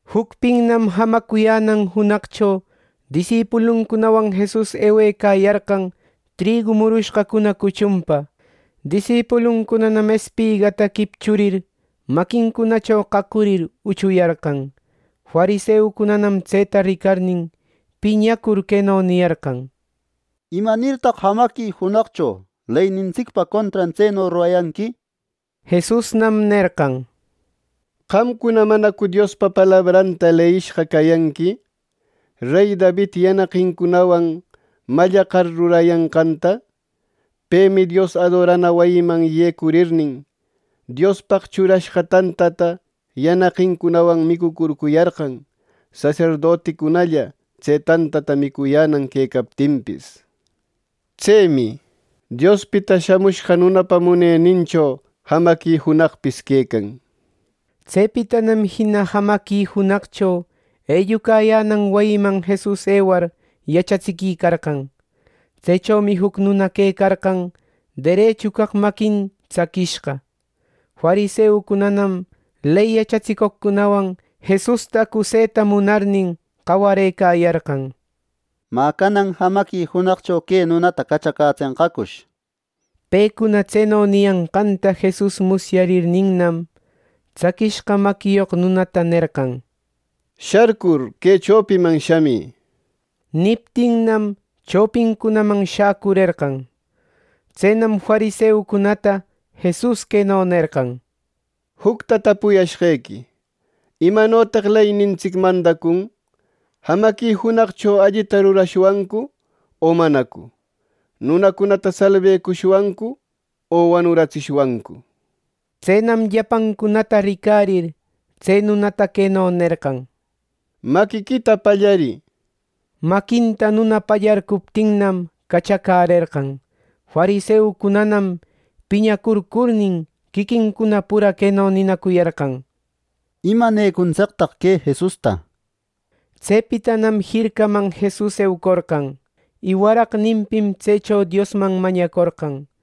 Jucpinnam jamacuyänan junaqcho disipuluncunawan Jesus ewecayarqan trigu murushqacuna cuchunpa. Disipuluncunanam espigata quipchurir, maquincunacho qaqurir, uchuyarqan. Fariseucunanam tseta ricarnin, piñacur queno niyarqan: —¿Imanirtaq jamaqui junaqcho leynintsicpa contran tseno rurayanqui! —nir. Jesusnam nerqan: —¿Qamcuna manacu Diospa palabranta leyishqa cayanqui, rey David yanaqincunawan mallaqar, rurayanqanta? Pemi Dios adorana wayiman yecurirnin, Diospaq churashqa tantata yanaqincunawan micucurcuyarqan, saserdoticunalla tse tantata micuyänan quecaptinpis. Tsemi Diospita Shamushqa Nunapa munenincho jamaqui junaqpis quecan. Tsepitanam jina jamaqui junaqcho ellucayänan wayiman Jesus ewar, yachatsiquicarqan. Tsechomi juc nuna quecarqan derechu caq maquin tsaquishqa. Fariseucunanam ley yachatsicoqcunawan Jesusta acuseta munarnin, qawarëcayarqan: —Mä, ¿canan jamaqui junaqcho que nunata cachacätsenqacush! —nir. Pecuna tseno niyanqanta Jesus musyarirninnam, tsaquishqa maquiyoq nunata nerqan: —Sharcur, que chopiman shamï. Niptinnam chopincunaman shacurerqan. Tsenam fariseucunata Jesus queno nerqan: —Jucta tapuyashqequi: ¿Imanotaq leynintsic mandacun? Jamaqui junaqcho ¿allita rurashwancu o manacu! ¿Nunacunata salbecushwancu o wanuratsishwancu! Tsenam llapancunata ricarir, tse nunata queno nerqan: —Maquiquita pallarï. Maquinta nuna pallarcuptinnam, cachacärerqan. Fariseucunanam piñacurcurnin, quiquincuna pura queno ninacuyarqan: —¿Imanecuntsictaq que Jesusta! —nir. Tsepitanam jircaman Jesus eucorqan, y waraqninpim tsecho Diosman mañacorqan.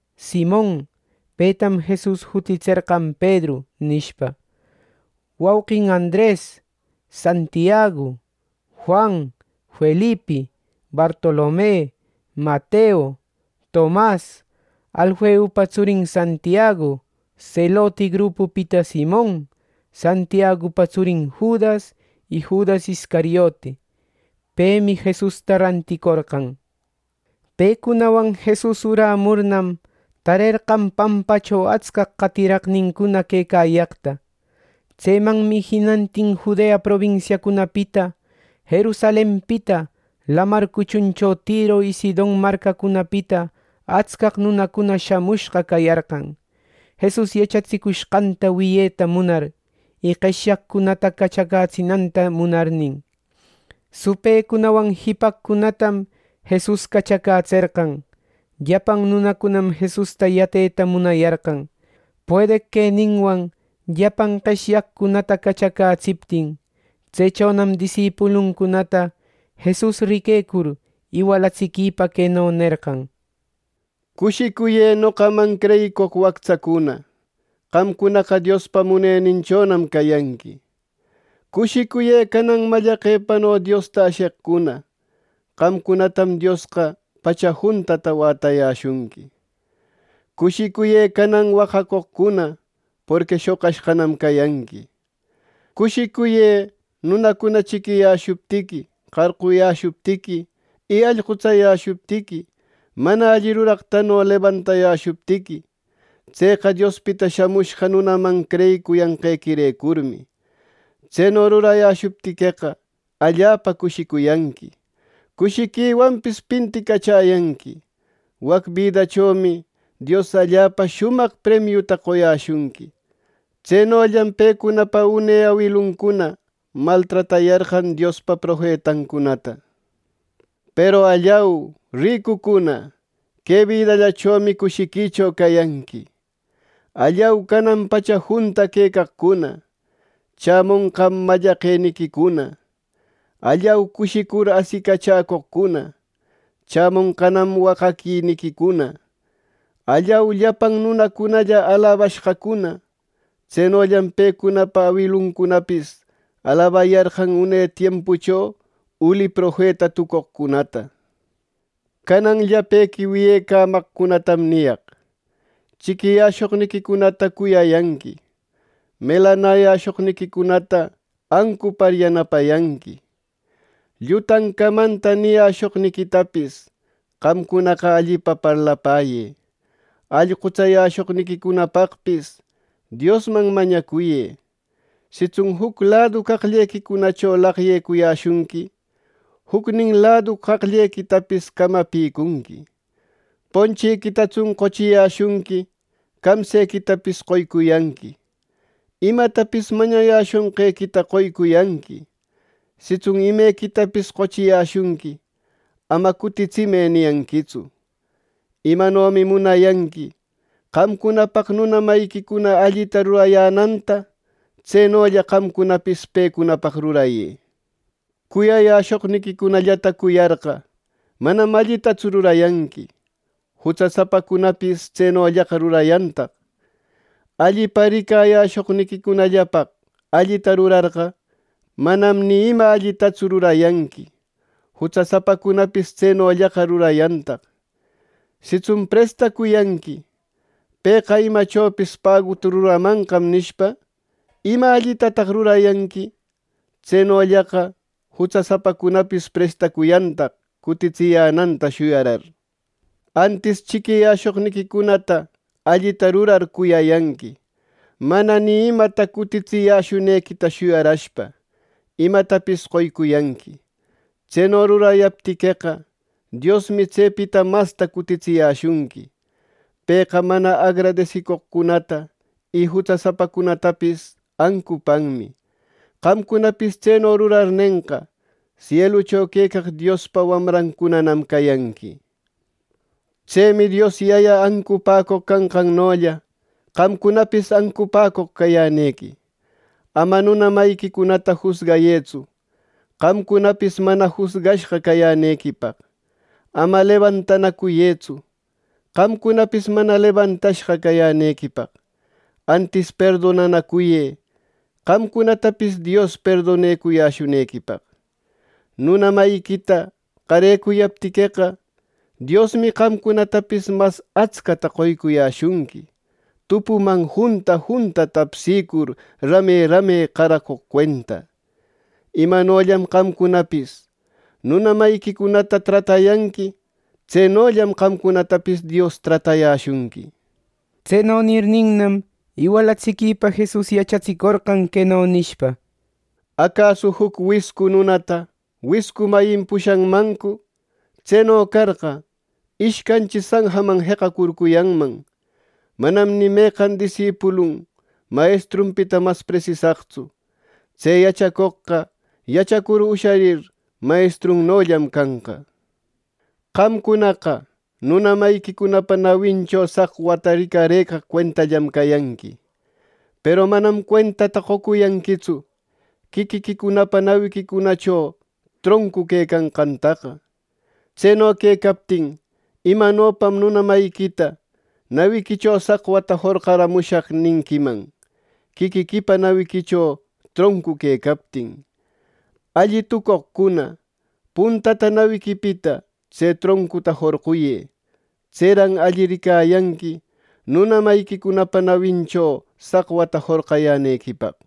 Simon (petam Jesus jutitserqan “Pedru” nishpa), wauqin Andres, Santiagu, Juan, Felipi, Bartolome, Mateo, Tomas, Alfeupa tsurin Santiagu, Seloti grupupita Simon, Santiagupa tsurin Judas, y Judas Iscariote. Pemi Jesusta ranticorqan. Pecunawan Jesus urämurnam, tarerqan pampacho atscaq qatiraqnincuna quecayaqta. Tsemanmi jinantin Judea probinsiacunapita, Jerusalenpita, lamar cuchuncho Tiro y Sidon marcacunapita atscaq nunacuna shamushqa cayarqan, ˻Jesus yachatsicushqanta wiyeta munar, y qeshyaqcunata cachacätsinanta munarnin˼. Supëcunawan jipaqcunatam Jesus cachacätserqan. Llapan nunacunam Jesusta yateta munayarqan, puedeq queninwan llapan qeshyaqcunata cachacätsiptin. Tsechonam disipuluncunata Jesus riquecur, iwalatsiquipa queno nerqan: “Cushicuyë, noqaman creyicoq waqtsacuna. Qamcunaqa Diospa Muneninchonam cayanqui. “Cushicuyë, canan mallaqepano Diosta asheqcuna. Qamcunatam Diosqa pacha juntata wätayäshunqui. “Cushicuyë, canan waqacoqcuna. Porqui shoqashqanam cayanqui. “Cushicuyë, nunacuna chiquiyäshuptiqui, qarquyäshuptiqui y allqutsayäshuptiqui, mana alli ruraqtano lebantayäshuptiqui, tseqa Diospita Shamushqa Nunaman creyicuyanqequirecurmi. Tseno rurayäshuptiqueqa allapa cushicuyanqui. Cushiquiwanpis pinticachäyanqui. Wac bidachomi Dios allapa shumaq premiuta qoyäshunqui. Tsenollam pecunapa une awiluncuna maltratayarqan Diospa profetancunata. “Peru ¡Allau, ricucuna! Que bidallachomi cushiquicho cayanqui. “¡Allau, canan pacha junta quecaqcuna! ¡Chämonqam mallaqueniquicuna! “¡Allau, cushicur asicachäcoqcuna! ¡Chämonqanam waqaquiniquicuna! “¡Allau, llapan nunacunalla alabashqacuna! Tsenollam pecunapa awiluncunapis alabayarqan une tiempucho uli profeta tucoqcunata. “Canan llapequi wiyecamaqnïcunatam niyaq: Chiquiyäshoqniquicunata cuyayanqui. Melanäyäshoqniquicunata ancupar, yanapayanqui. Llutan camanta niyäshoqniquitapis qamcunaqa allipa parlapäyë; allqutsayäshoqniquicunapaqpis, Diosman mañacuyë. Sitsun juc ladu qaqllequicunacho laqyecuyäshunqui, jucnin ladu qaqllequicunatapis camapïcuyanqui. Ponchiquitatsun qochiyäshunqui, camsequitapis qoycuyanqui. Imatapis mañayäshonqequita qoycuyanqui. Sitsun imequitapis qochiyäshunqui, ama ‘Cutitsimë’ niyanquitsu. Imanomi munayanqui qamcunapaq nuna mayiquicuna allita rurayänanta, tsenolla qamcunapis pecunapaq rurayë. “Cuyayäshoqniquicunallata cuyarqa, manam allitatsu rurayanqui. ¡Jutsasapacunapis tsenollaqa rurayantaq! Allipa ricayäshoqniquicunallapaq allita rurarqa, manam ima allitatsu rurayanqui. ¡Jutsasapacunapis tsenollaqa rurayantaq! Sitsun prestacuyanqui, ‘Pëqa imachopis paguta ruramanqam’ nishpa, ¿ima allitataq rurayanqui? Tsenollaqa jutsasapacunapis prestanacuyantaq, cutitsiyänanta shuyarar. Antis chiquiyäshoqniquicunata allita rurar, cuyayanqui. Mana ni imata cutitsiyäshunequita shuyarashpa, imatapis qoycuyanqui. Tseno rurayaptiqueqa, Diosmi tsepita masta cutitsiyäshunqui. Pëqa mana agradesicoqcunata y jutsasapacunatapis ancupanmi. Qamcunapis tseno rurarnenqa, sielucho quecaq Diospa wamrancunanam cayanqui. Tsemi Dios Yaya ancupäcoq canqannolla, qamcunapis ancupäcoq cayänequi. “Ama nuna mayiquicunata jusgayëtsu, qamcunapis mana jusgashqa cayänequipaq. Ama lebantanacuyëtsu, qamcunapis mana lebantashqa cayänequipaq. Antis perdonanacuyë, qamcunatapis Dios perdonayäshunequipaq. Nuna mayiquita qarecuyaptiqueqa, Diosmi qamcunatapis mas atscata qoycuyäshunqui, tupuman junta junta tapsïcur, rame rame qaracoq cuenta. Imanollam qamcunapis nuna mayiquicunata tratayanqui, tsenollam qamcunatapis Dios tratayäshunqui.” Tseno nirninnam, iwalatsiquïpa Jesus yachatsicorqan, queno nishpa: —¿Acasu juc wiscu nunata wiscu mayin pushanmancu! Tseno carqa, ¡ishcanchi sanjaman jeqacurcuyanman! Manam ni meqan disipulupis mayestrunpita mas presisaqtsu. Tse yachacoqqa yachacur usharir, mayestrunnollam canqa. “Qamcunaqa nuna mayiquicunapa nawincho saqwata ricarëcaq cuentallam cayanqui; ¡peru manam cuentata qocuyanquitsu quiquiquicunapa nawiquicunacho troncu quecanqantaqa! Tseno quecaptin ¿imanopam nuna mayiquita ‘Nawiquicho saqwata jorqaramushaq’ ninquiman, quiquiquipa nawiquicho troncu quecaptin! ¡Alli tucoqcuna, puntataraq nawiquipita tse troncuta jorquyë! Tseran alli ricayanqui nuna mayiquicunapa nawincunacho saqwata jorqayänequipaq.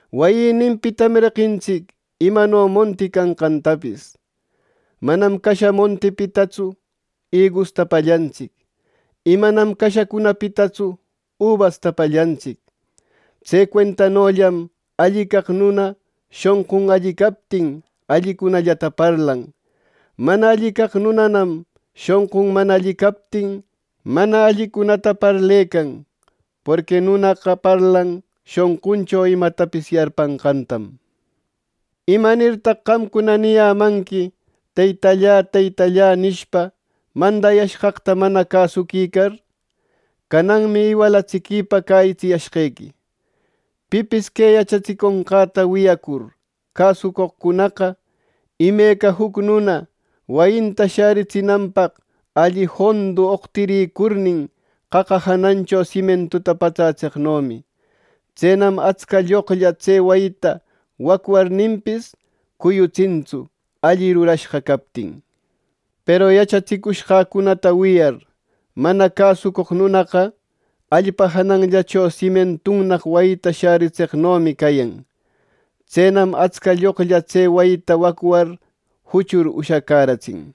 Wayïninpitam reqintsic imano monti canqantapis. Manam casha montipitatsu igusta pallantsic. Y manam cashacunapitatsu ubasta pallantsic. Tse cuentanollam alli caq nuna shonqun alli captin, allicunallata parlan; mana alli caq nunanam shonqun mana alli captin, mana allicunata parlecan. Porqui nunaqa parlan shonquncho imatapis yarpanqantam. “¿Imanirtaq qamcuna niyämanqui ‘Teytallä, Teytallä’ nishpa, mandayashqaqta mana cäsuquicar? Cananmi iwalatsiquipa cäyitsiyashqequi: Pipis que yachatsiconqäta wiyacur, cäsucoqcunaqa, imeca juc nuna wayinta shäritsinanpaq alli jondu oqtirïcurnin, qaqa janancho simientuta patsätseqnomi. Tsenam atsca lloqlla tse wayita wacwarninpis, cuyutsintsu, alli rurashqa captin. Peru yachatsicushqäcunata wiyar, mana cäsucoq nunaqa allpa jananllacho simientunnaq wayita sharcatseqnomi cayan. Tsenam atsca lloqlla tse wayita wacwar, juchur ushacäratsin.”